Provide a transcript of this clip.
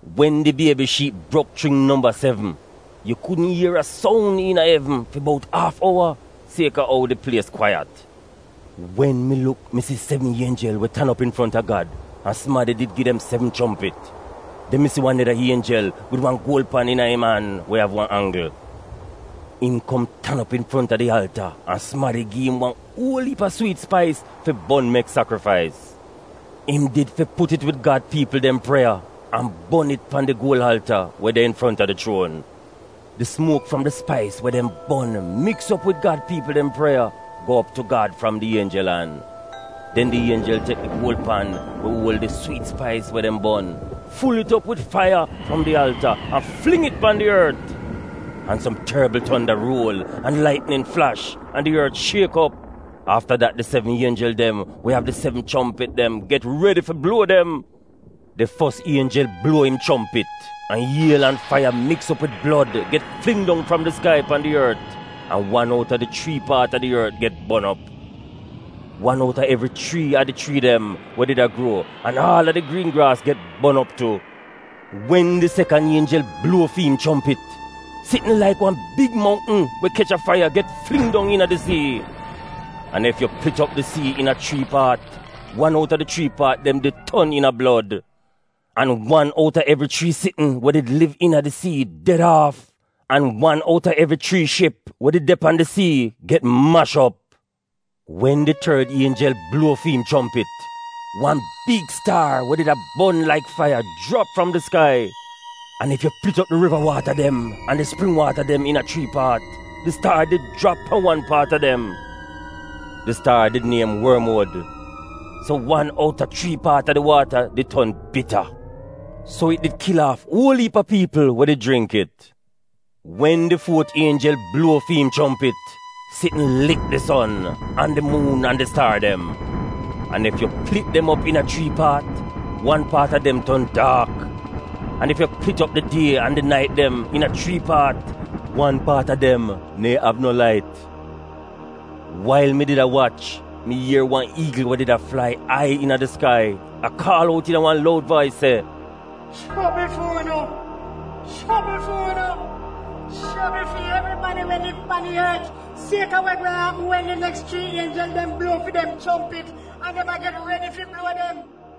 Wen di Biebi Shiip brok chring nomba sevn, yu kudn ier a soun iina evn fi bout aaf owa sieka ou di plies kwaiyat. Wen mi luk mi si sevn ienjel we tan op infronta Gad an sumadi did gi dem sevn chompit. Den mi si wan neda ienjel wid wan guol pan iina im an we av wan anggl. Im kom tan op infronta di alta an sumadi gi im wan uol iip a swiit spais fi bon mek sakrifais. Im did fi put it wid Gad piipl dem prieya an bon it pan di guol alta we de infronta di chuon. Di sumuok fram di spais we dem bon, miks op wid Gad piipl dem prieya, go op tu Gad fram di ienjel an. Den di ienjel tek di guol pan we uol di swiit spais we dem bon, ful it op wid faiya fram di alta, an fling it pan di ort. An som torbl tonda ruol, an laitnin flash, an di ort shiek op. Afta dat, di sevn ienjel dem we av di sevn chompit dem get redi fi bluo dem. Di fos ienjel bluo im chompit, an iel an faiya miks op wid blod get fling dong fram di skai pan di ort an kwaata a di ort get bon op. Aal a di chrii dem an di an aal a di griin graas pan da paat a di ort de get bon op. Wen di sekan ienjel bluo fi im chompit, sitn laik wan big mountn we kech a faiya get fling dong iina di sii. An ef yu plit op di sii iina chrii paat, wan outa di chrii paat dem did ton iina blod. An wan outa evri chrii sitn we did liv iina di sii ded aaf, an wan outa evri chrii ship we did de pan di sii get mash op. Wen di tord ienjel bluo fi im chompit, wan big staar we did a bon laik faiya jrap fram di skai. An ef yu plit op di riva waata an di spring waata iina chrii paat, di staar did jrap pan wan paat a dem. Di staar did niem Bitanis. So wan outa chrii paat a di waata did ton bita. So it did kil aaf uol iip a piipl we did jringk it. Wen di fuot ienjel bluo fi im chompit, sitn lik di son, an di muun an di staar dem. An ef yu plit dem op iina chrii paat, wan paat a dem ton daak. An ef yu plit op di die an di nait dem iina chrii paat, wan paat a dem neehn av no lait. Wail mi did a wach, mi ier wan iigl a flai ai iina di skai an a kaal out iina wan loud vais se: “Chobl fu'unu! Chobl fu'unu! Chobl fi evribadi we liv pan di ort, sieka wa gweehn apm wen di neks chrii ienjel dem bluo fi dem chompit, an dem a get redi fi bluo dem!”